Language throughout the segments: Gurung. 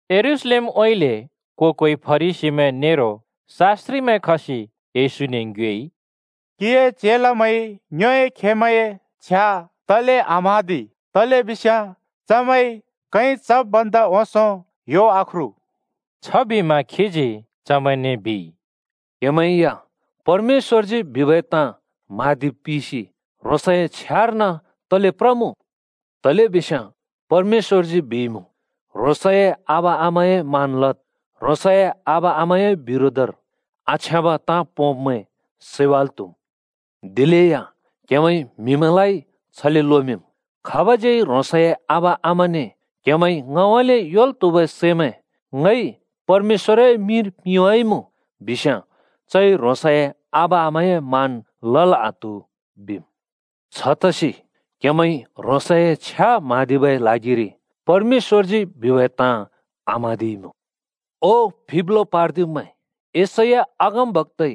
यरूशलेमउँइँले को-कोइ फरिसीमैं नेरो शास्‍त्रिमैं खसि येशूने ङ्योएइ, “क्‍हिए चेलामैंइ ङ्योए खेमैंए छ्या तले आम्हाँदि? तलेबिस्याँ चमैंइ कैं चब् भन्दा ओंसों यो आख्रु।” छबिमा खीजी चमैंने बिइ, “क्‍हेमैं या परमेश्‍वरजी बिबै ताँ म्हाँदिब् पिसि ह्रोंसए छ्यार्न तले प्रमुँ? तलेबिस्याँ परमेश्‍वरजी बिइमुँ, ‘ह्रोंसए आबा आमाए मान लद्। ह्रोंसए आबा आमाए बिरोधर आछ्याँब ताँ पोंब्मैं सैवाल् त्हुम्।’ दिलेया क्हेमैंइ म्हिमैंलाइ छले लोमिंम्, ‘खाबज्यै ह्रोंसए आबा आमाने “क्हेमैंइ ङउँइँले योंल् त्हुबै सैमैं ङइ परमेश्‍वरए मिंर पिंवाइमुँ” बिस्याँ चइ ह्रोंसए आबा आमाए मान लल् आत्हु,’ बिम्। छतसि क्हेमैंइ ह्रोंसए छ्या म्हाँदिबै ल्हागिरि परमेश्‍वरजी बिबै ताँ आम्हाँदिइमुँ। ओ फिप्लो पार्दिब्मैं, यशैया अगमबक्‍ताइ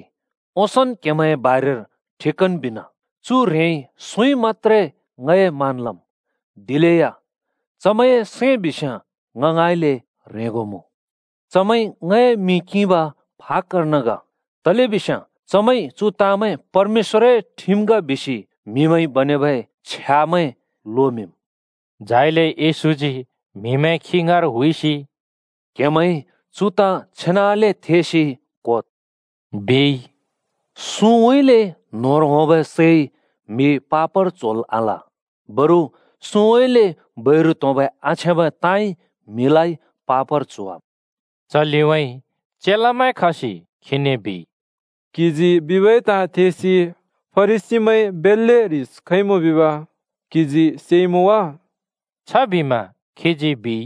ओंसोंन् क्‍हेमैंए बारेर ठिकन बिना, ‘चु ह्रेंइ सुँइ मत्‍त्रे ङए मान लम्, दिलेया चमैंए सैं बिस्‍याँ ङ ङाँइँले ह्रेंगो मुँ। चमैंइ ङए मिं किंब फाक्‍कर्न ग, तलेबिस्याँ चमैंइ “चु ताँमैं परमेश्‍वरए ठिम ग” बिसि म्हिमैंइ बनेबै छ्यामैं लोमिंम्।’” झाइले येशूजी म्‍हिमैं खी ङाँर हुइसि “क्‍हेमैंइ चु ताँ छेनाले थेसि क्होद्,” बिइ। “सुँउँइँले न्‍होंर होंबै सैइ म्हि पापर च्होल् आल। बरु सुँउँइँले बैरु त्‍होंबै आछ्याँबै ताँइ म्हिलाइ पापर च्होवाम्।” च लिउँइँ चेलामैं खसि खीने बिइ, “क्‍हिजी बिबै ताँ थेसि फरिसीमैं बेल्‍ले ह्रिस खइमुँ बिब क्‍हिजी सेइमुँ वा?” छबिमा खीजी बिइ,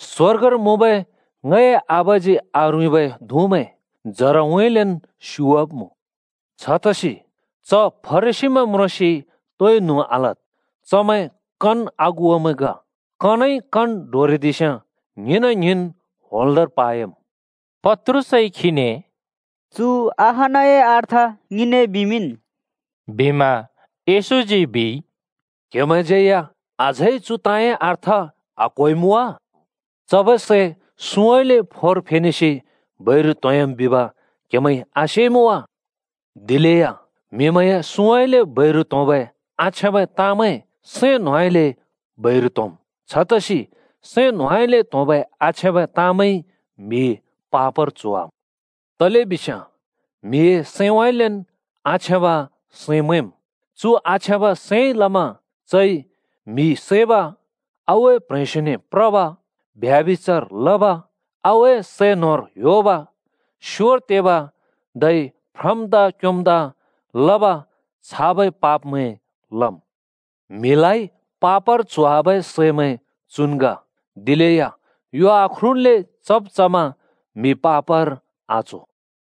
“स्वर्गर मुँबै ङए आबाजी आरुँइँबै धुँमैं जरान् स्‍युवाब्‍मुँ। छतसि च फरिसीमैं म्रोंसि तोइ न्हुँ आलद्। चमैं कन अगुवामैं ग। कनइ कन डोरिदिस्‍याँ, ङ्हिंना ङ्हिंन् होंल्‍दोंर पायाम्।” पत्रुसइ खीने “चु अहानए अर्थ ङिने बिमिंन्,” बिमा येशूजी बिइ, “क्‍हेमैंज्यै या अझै चुए अर्थ आक्‍होइमुँ वा? चबै सै सुँउँइँले फोर फेनेसि बैरु त्‍होंह्‍याम् बिब क्‍हेमैंइ आसेइमुँ वा? दिलेया म्‍हिमैंए सुँउँइँले बैरु त्‍होंबै आछ्याँबै ताँमैं सैं न्‍होंउँइँले बैरु त्‍होंम्। छतसि सैं न्होंउँइँले त्होंबै आछ्याँबै ताँमैंइ म्‍हि पापर च्होवाम्। तलेबिस्याँ म्‍हिए सैंउँइँलेन् आछ्याँब सैं मैंम्। चु आछ्याँब सैंइ लमा चइ म्‍हि सैब, आगुए प्ह्रेंस्यो प्रब, ब्यभिचार लब, आगुए सै न्होर ह्‍योब, स्‍योर तेब, धै फ्रम्दा क्योम्दा लब छाबै पापमैं लम्। म्‍हिलाइ पापर च्होवाबै सैमैं चुन् ग। दिलेया यो आख्रुल्‍ले चब् चमा म्हि पापर आच्हो।”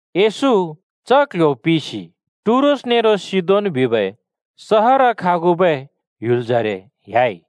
येशू च क्‍ल्‍ह्‍यो पिसि टुरोस नेरो सिदोन बिबै सहर खागुबै ह्‍युलजरे ह्‍याइ।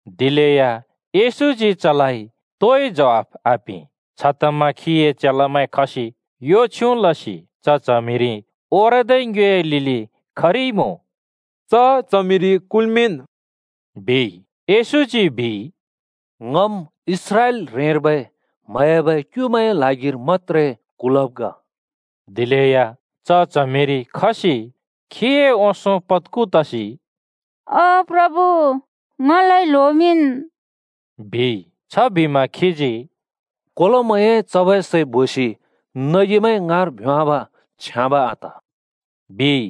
दिलेया येशूजी चने तोइ ज्वाफ आपिं। छतमा खीए चेलामैं खसि यो छ्युँ लसि च च्हमिरि ओरदै ङ्योए लिलि खरिइमुँ “च च्हमिरि कुल्मिंन्,” बिइ। येशूजी बिइ, “ङम् इस्राएल ह्रेंर्बै म्‍हयाबै क्‍युमैंए ल्हागिर मत्‍त्रे कुलब् ग।” दिलेया च च्हमिरि खसि खीए ओंसों पत्खु तसि “ओ प्रभु, ङलाइ ल्होमिंन्,” बिइ। छबिमा खीजी “कोलोमैंए चबै सै बोसि नगिमैं ङाँर भ्योंवाब छ्याँब आत,” बिइ।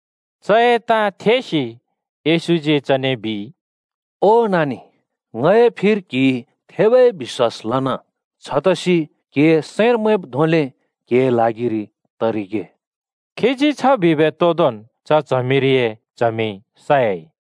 चए ताँ थेसि येशूजी चने बिइ, “ओ नानि, ङए फिर क्‍हिइ थेबै बिश्‍वास लना! छतसि क्‍हिए सैंर मैंब् धोंले क्हिए ल्हागिरि तरिगे।” खीजी छ बिबै तोदोंन् च च्हमिरिए च्हमि सयाइ।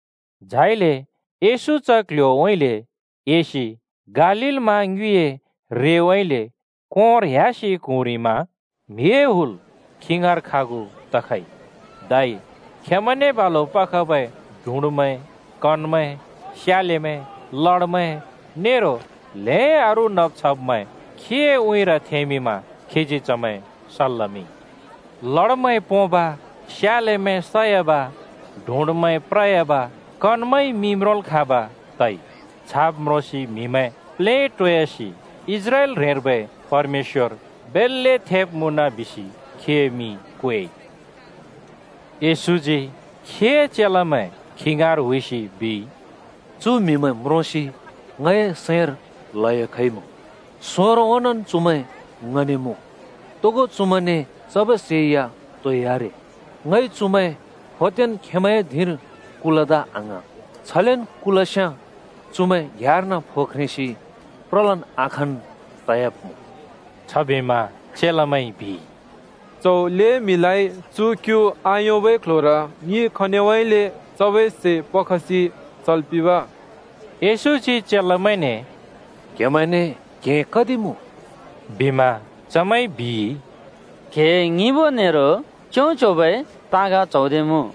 झाइले येशू च क्‍ल्‍ह्‍योउँइँले एसि गालील मा ङ्युँइए रेउँइँले कोंर ह्‍यासि क्हुँरिमा म्हिए हुल खी ङाँर खागु तखइ। धै खेंमैंने बालु पखबै डुँडमैं, कनमैं, स्यालेमैं, लडामैं नेरो ल्‍हें अरू नब् छब्मैं खीए उँइँर थेंमिंमा खीजी चमैं सल् लमिंइ। लडमैं पोंब, स्यालेमैं सयाब, डुडमैं प्रयाब, कनमैंइ म्रोंल् खाँब् तइ। छाब् म्रोंसि म्‍हिमैं प्लेटोयासि इस्राएल ह्रेंर्बै परमेश्‍वर बेल्‍ले थेब मुँन बिसि खीए मिं क्वेइ। येशूजी खीए चेलामैं खी ङाँर हुइसि बिइ, “चु म्‍हिमैं म्रोंसि ङए सैंर ल्‍हयो खइमुँ। सोंरो ओंनोंन् चुमैं ङने मुँ, तोगो चुमैंने चबै सै या तोइ आरे। ङइ चुमैं फोदेंन् खेंमैंए धिंर कुलदा आङ्हाँ। छलेन् कुलस्‍याँ चुमैं घ्‍याँर्न फो ख्रेंसि प्रलन् आखाँन् तयाब्मुँ।” छबिमा चेलामैंइ बिइ, “च्‍हौ ल्‍हें म्‍हिलाइ चु क्यु आयोंबै क्ल्ह्‍योर ङिइ खनिउँइँले चबै सै पखसि चल् पिंब?” येशूजी चेलामैंने “क्‍हेमैंने क्‍हें कति मुँ?” बिमा चमैंइ बिइ, “क्‍हें ङिबो नेरो च्यों-च्योंबै ताँग च्हौदे मुँ।”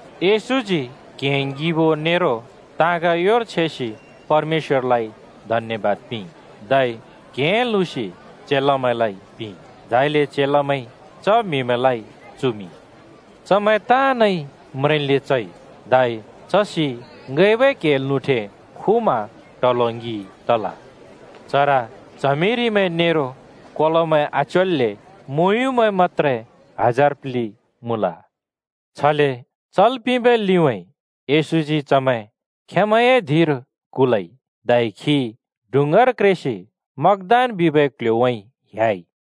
येशूजी क्‍हें ङिबो नेरो ताँग योर छेसि परमेश्‍वरलाइ धन्‍यबाद पिंइ। धै क्‍हें लुँसि चेलामैंने पिंइ, झाइले चेलामैंइ च म्‍हिमैंलाइ चुमिंइ। चमैं ताँनइ म्रेंन्ले चइ। धै चसि ङैंबै क्हें लुँठे खुमा ट्हलो ङि तल। चर च्हमिरिमैं नेरो कोलोमैं आच्योल्‍ले मुँयुँमैं मत्‍त्रे हजार प्लि मुँल। छले चल् पिंबै लिउँइँ येशूजी चमैं खेंमैंए धिंर कुलइ धै खी डुँङ्गार क्रेसि मगदान बिबै क्‍ल्‍ह्‍योउँइँ ह्‍याइ।